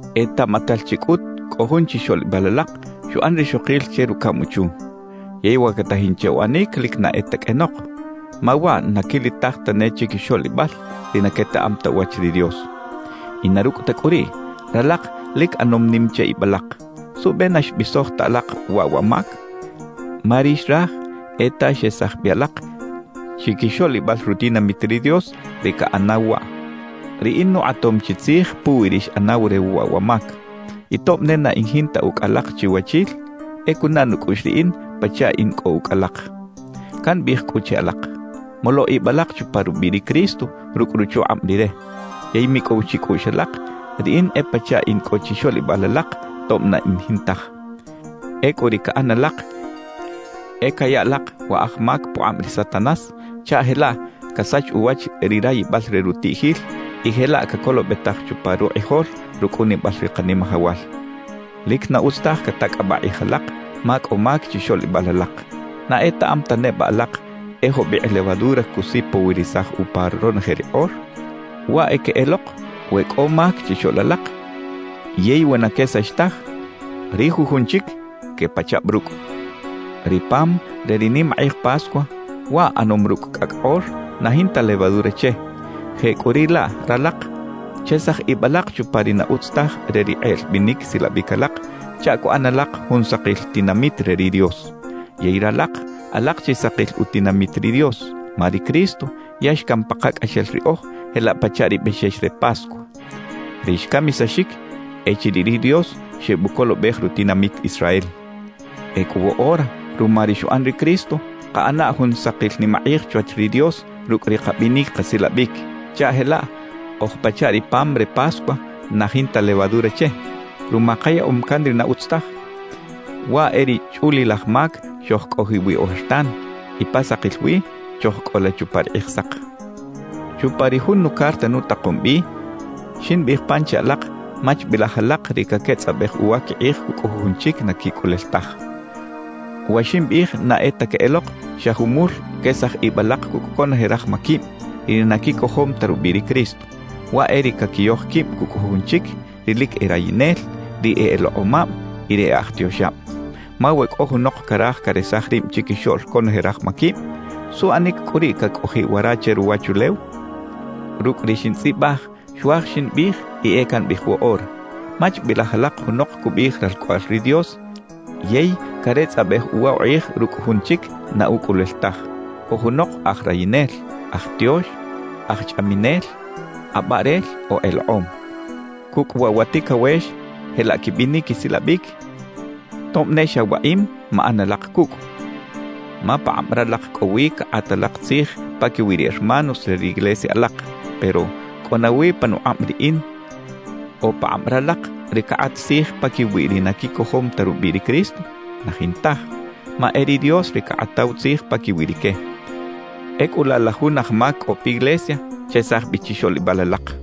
Etaꞌmatal chi cꞌut cꞌo jun chixoꞌlibal alak xuꞌan rixokil che rucaꞌm uchu. Yey wa catajin che uꞌanic lic na e ta qꞌuenok, ma waꞌ na quilitaj tane chiquixoꞌlibal ri na quetaꞌam ta uwach ri Dios. Y na rucꞌ ta cꞌu riꞌ, ¡ralak lic ꞌanom nim che ib alak! ¿Suꞌbe na xbisoj ta alak waꞌ wa mac? Ma ri xraj e ta xesaj bi alak chiquixoꞌlibal rutinamit ri Dios ri caꞌanaw waꞌ. Riꞌin nukꞌatom chi tzij puwi ri xꞌanaw re waꞌ wa mac. Y tob ne na in jinta ucꞌ alak chiwachil, e cunaꞌ nucꞌuꞌx riꞌin pachaꞌ in cꞌo ucꞌ alak. Cambiꞌij cꞌu che alak, molo ib alak chupa rubiꞌ ri Cristo rucꞌ ruchukꞌab Rire; yey micꞌow chicꞌuꞌx alak, riꞌin e pachaꞌ in cꞌo chixoꞌlibal alak tob na in jintaj. Ecꞌu ri caꞌan alak e caya alak wa aj mac pukꞌab ri Satanás chaꞌ jelaꞌ casach uwach ri rayibal re rutiꞌjil y jelaꞌ cacolobetaj chupa rukꞌijol rucꞌunibal ri Kanimajawal. Lic na utz taj catacꞌabaꞌ kꞌij alak ma cꞌo mac chixoꞌlibal alak. ¿Na etaꞌam ta neba alak e jubikꞌ levadura cusipowirisaj upa ronoje ri kꞌor? Waꞌ e queꞌelok, we cꞌo mac chixoꞌl alak yey we na quesax taj, ri jujun chic quepachab rucꞌ. Ri pam re ri nimakꞌij Pascua, waꞌ ꞌanom rucꞌ cꞌacꞌ kꞌor na jinta levadura che; jecꞌuriꞌlaꞌ ralak, chesaj ib alak chupa ri na utz taj re ri kꞌeꞌl binic silabic alak chaꞌ cuꞌan alak jun sakil tinamit re ri Dios. Yey ralak alak chi sakil utinamit ri Dios, ma ri Cristo ya xcam pakacꞌaxel riꞌoj jelaꞌ pachaꞌ ri bexex re Pascua, ri xcamisaxic echiriꞌ ri Dios xebucolobej rutinamit Israel. Ecꞌu woꞌora ruma ri xuꞌan ri Cristo, kaꞌana jun sakil nimakꞌij chwach ri Dios rucꞌ ri kabinic kasilabic, chaꞌ jelaꞌ oj pachaꞌ ri pam re Pascua na jinta levadura che, ruma kayaꞌom can ri na utz taj, waꞌ e ri chꞌulilaj mac xojcꞌojiꞌ wi ojertan, y pa sakil wi chojcꞌola chupa ri Kꞌijsak. Chupa ri jun nucarta nutakom bi, ximbiꞌij pan che alak machbilaj alak ri caquetzꞌabej uwa quikꞌij cucꞌ jujun chic na quicꞌulel taj. Wa ximbiꞌij na e ta queꞌelok xa jumul quesaj ib alak cucꞌ conoje raj maquib, ri na quicojom ta rubiꞌ ri Cristo. Waꞌ e ri caquiyoj quib cucꞌ jujun chic, ri lic e rayinel, ri e elekꞌomab y ri e aj tioxab. Ma we cꞌo junok caraj caresaj rib chiquixoꞌl conoje raj maquib, ¿suꞌanic cꞌu riꞌ cacꞌojiꞌ wara che ruwachulew? Rucꞌ ri xintzꞌibaj xuaj ximbiꞌij y e cambiꞌij woꞌora: Machbilaj alak junok cubiꞌij ralcꞌoꞌal ri Dios yey caretzꞌabej uwa ukꞌij rucꞌ jun chic na ucꞌulel taj, o junok aj rayinel, aj tiox, aj chꞌaminel, kꞌabaꞌrel o elekꞌom. Cucꞌ waꞌ wa ticawex jelaꞌ quibinic quisilabic, tob ne xa waꞌim maꞌan alak cucꞌ. Ma pakꞌab ralak cꞌo wi cakꞌat alak tzij paquiwi ri hermanos re ri iglesia alak. Pero ¿cꞌo nawi panukꞌab riꞌin o pakꞌab ralak ri cakꞌat tzij paquiwi ri na quicojom ta rubiꞌ ri Cristo? Na jintaj, ma e ri Dios ri cakꞌataw tzij paquiwi rique. Ecꞌu laꞌ la jun aj mac cꞌo piglesia, chesaj bi chixoꞌlibal alak.